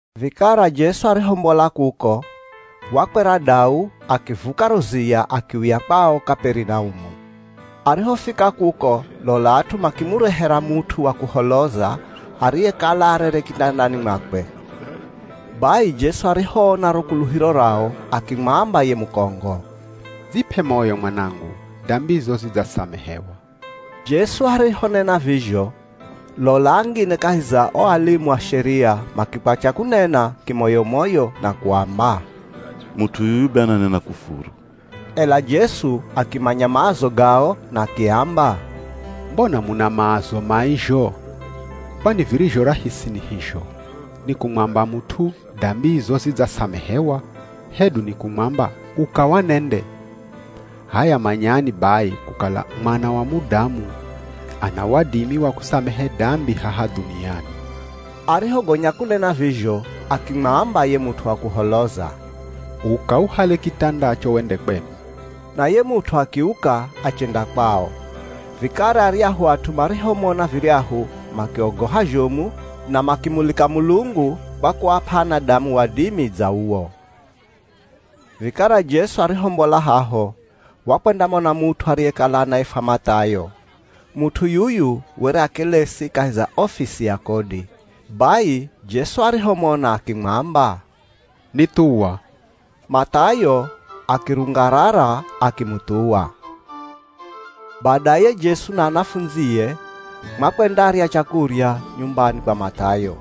Vikara Jesu arihombola kuko, wakwera dau akivuka ro ziya akiuya kwao Kaperinaumu. Arihofika kuko lola at'u makimurehera mut'u wa kuholoza ariyekala arere kitandani mwakwe. Bai Jesu arihoona ro kuluhiro rao, akimwamba ye mukongo, “Dzip'e moyo mwanangu, dambizo zidzasamehewa.” Jesu arihonena vizho, lola angine kahi za o alimu a Sheria makikwatya kunena kimoyo-moyo na kuamba, “Mut'u yuyu be ananena kufuru.” Ela Jesu akimanya maazo gao, na akiamba, “Mbona muna maazo mai zho? Kwani, virizho rahisi ni hizho? Ni kumwamba mut'u, ‘Dambizo zidzasamehewa,’ hedu ni kumwamba, ‘Uka wanende?’ H'aya manyani bai, kukala Mwana wa Mudamu ana wadimi wa kusamehe dambi haha dhuniani.” Arihogonya kunena vizho, akimwamba ye mut'u wa kuholoza, “Uka uhale kitandacho wende kwenu.” Na ye mut'u akiuka, achenda kwao. Vikara aryahu at'u marihomona viryahu makiogoha zhomu, na makimulika Mulungu kwa kuap'a anadamu wadimi dza uwo. Vikara Jesu arihombola haho, wakwendamona mut'u ariyekala anaifwa Math'ayo. Mut'u yuyu were akelesi kahi za ofisi ya kodi. Bai Jesu arihomona, akimwamba, “Nithuwa.” Math'ayo akirungarara akimuthuwa. Badaye Jesu na anafundzie, makwendarya chakurya nyumbani kwa Math'ayo.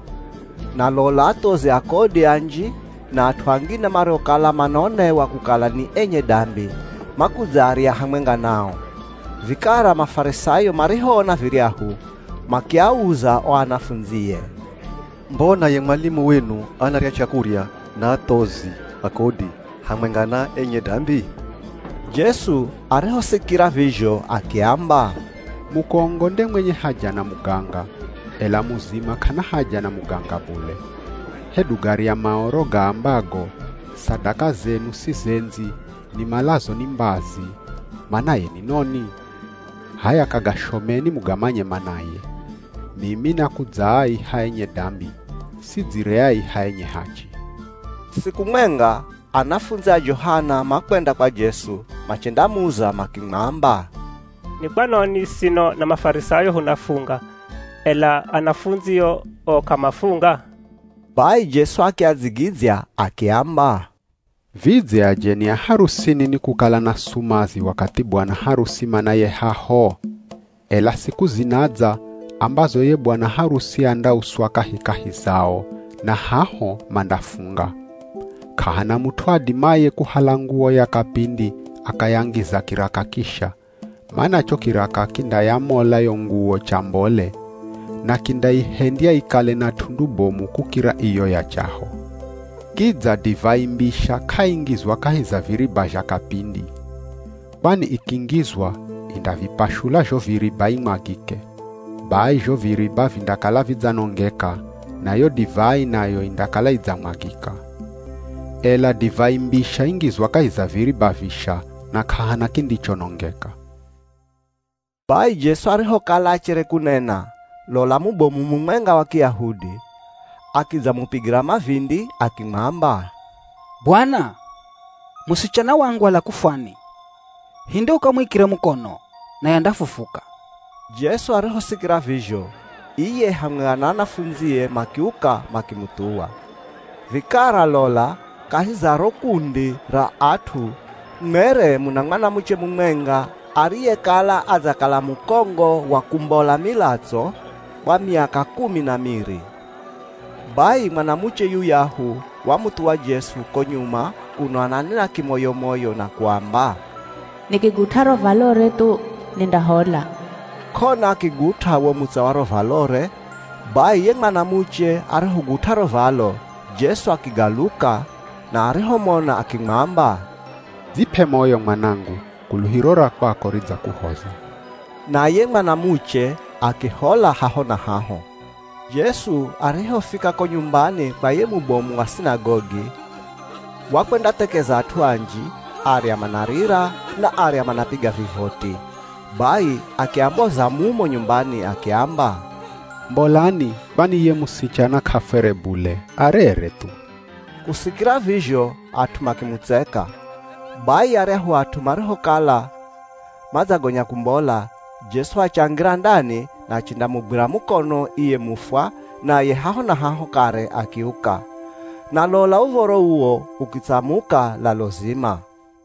Na lola athozi a kodi anji na at'u angine mariokala manaonewa kukala ni enye dambi, makudzarya hamwenga nao. Vikara Mafarisayo marihoona viryahu, makiauza o anafundzie, “Mbona ye mwalimu wenu anarya chakurya na athozi a kodi hamwenga na enye dambi?” Jesu arihosikira vizho akiamba, “Mukongo nde mwenye haja na muganga, ela muzima k'ana haja na muganga bule. Hedu garya Maoro gaambago, ‘Sadaka zenu sizendzi, nimalazo ni mbazi,’ manaye ni noni? H'aya kagashomeni mugamanye manaye. Mimi nakudzaaiha enye dambi, sidzireaiha enye hachi!” Siku mwenga, anafundzi a Johana makwenda kwa Jesu, machendamuza makimwamba, “Ni kwanoni sino na Mafarisayo hunafunga, ela anafundzio o k'amafunga?” Bai Jesu akiadzigidzya akiamba, “Vidze ajeni a harusini nikukala na sumazi wakathi bwana harusi manaye haho? Ela siku zinadza, ambazo ye bwana harusi andauswa kahikahi zao, na haho mandafunga. K'ahana mut'u adimaye kuhala nguwo ya kapindi akayangiza kiraka kisha, mana cho kiraka kindayamola yo nguwo chambole, na kindaihendya ikale na t'undu bomu kukira iyo ya chaho. Kidza, divai mbisha k'aingizwa kahi za viriba zha kapindi. Kwani ikingizwa, indavipashula zho viriba imwagike. Bai zho viriba vindakala vidzanongeka, na yo divai nayo indakala idzamwagika. Ela divai mbisha ingizwa kahi za viriba visha, na k'ahana kindichonongeka.” Bai Jesu arihokala achere kunena, lola mubomu mumwenga wa Kiyahudi, akidzamupigira mavindi akimwamba, “Bwana, musichana wangu ala kufwani, hinde ukamuikire mukono naye andafufuka.” Jesu arihosikira vizho, iye hamwenga na anafundzie makiuka makimuthuwa. Vikara lola, kahi za ro kundi ra at'u mwere muna mwanamuche mumwenga ariyekala adzakala mukongo wa kumbola milatso kwa miaka kumi na miri. Bai mwanamuche yuyahu wamuthuwa Jesu ko nyuma kuno ananena kimoyo-moyo na kuamba, “Nikigut'a ro valore thu, nindahola.” K'ona akigut'a wo mutsa wa ro valore. Bai ye mwanamuche arihogut'a ro valo, Jesu akigaluka, na arihomona akimwamba, “Dzip'e moyo mwanangu, kuluhiro ra kwako ridzakuhoza.” Na ye mwanamuche akihola haho na haho. Jesu arihofika ko nyumbani kwa ye mubomu wa sinagogi, wakwendathekeza at'u anji. Arya manarira, na arya manapiga vivoti. Bai akiamboza mumo nyumbani akiamba, “Mbolani, kwani ye musichana k'afwere bule, arere thu.” Kusikira vizho at'u makimutseka. Bai aryahu at'u marihokala madzagonya kumbola, Jesu achangira ndani, na achendamugwira mukono iye mufwa, naye haho na haho kare akiuka. Na lola uv̱oro uwo ukitsamuka lalo zima.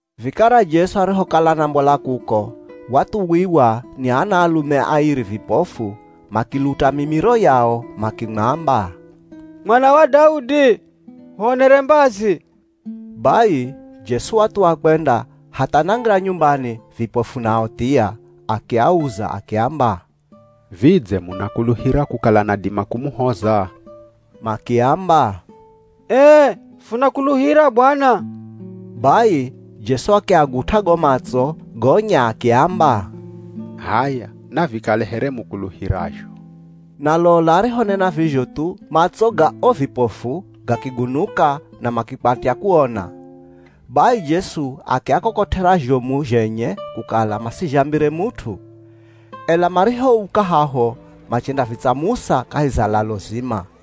Vikara Jesu arihokala anambola kuko, wathuwiwa ni anaalume airi vipofu, makiluta mimiro yao makimwamba, “Mwana wa Daudi, huonere mbazi!” Bai Jesu wathuwa kwenda hatha anangira nyumbani, vipofu nao thia. Akiauza akiamba, “Vidze munakuluhira kukala nadima kumuhoza?” Makiamba, “Ee, funakuluhira Bwana.” Bai Jesu akiagut'a go matso, gonya akiamba, “H'aya navikale here mukuluhirazho.” Na lola arihonena vizho thu, matso ga o vipofu gakigunuka na makikwatya kuona. Bai Jesu akiakokot'era zhomu zhenye kukala masizhambire mut'u. Ela marihouka haho, machendavitsamusa kahi za lalo zima.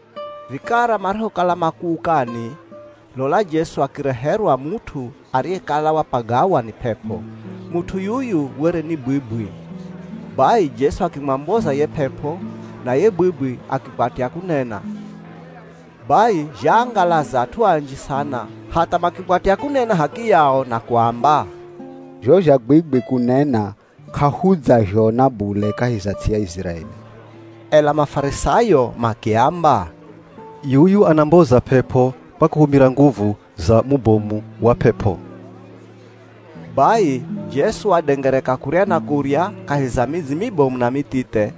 Vikara marihokala makuukani, lola Jesu akireherwa mut'u ariyekala wapagawa ni p'ep'o. Mut'u yuyu were ni bwibwi. Bai, Jesu akimwamboza ye p'ep'o na ye bwibwi akikwatya kunena. Bai zhaangalaza at'u anji sana hatha makikwatya kunena h'akiyao na kuamba, “Zho zha bwibwi kunena k'ahudzazhona bule kahi za ts'i ya Iziraeli!” Ela Mafarisayo makiamba, “Yuyu anamboza p'ep'o kwa kuhumira nguvu za mubomu wa p'ep'o.” Bai Jesu wadengereka kurya na kurya, kahi za midzi mibomu na mithithe,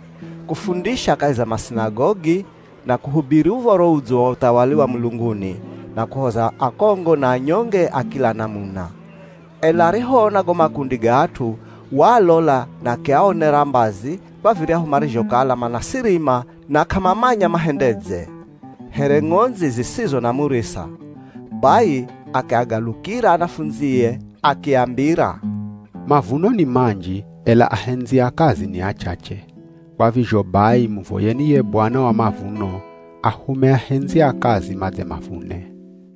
kufundisha kahi za masinagogi, na kuhubiri Uv̱oro Udzo wa uthawali wa mulunguni, na kuhoza akongo na anyonge a kila namuna. Ela arihoona go makundi ga at'u, waalola na akiaonera mbazi, kwa viryahu marizhokala manasirima na k'amamanya mahendedze, here ng'ondzi zisizo na murisa. Bai akiagalukira anafundzie akiambira, “Mavuno ni manji, ela ahendzi a kazi ni achache. Kwa vizho bai muvoyeni ye Bwana wa mavuno, ahume ahendzi a kazi madze mavune.”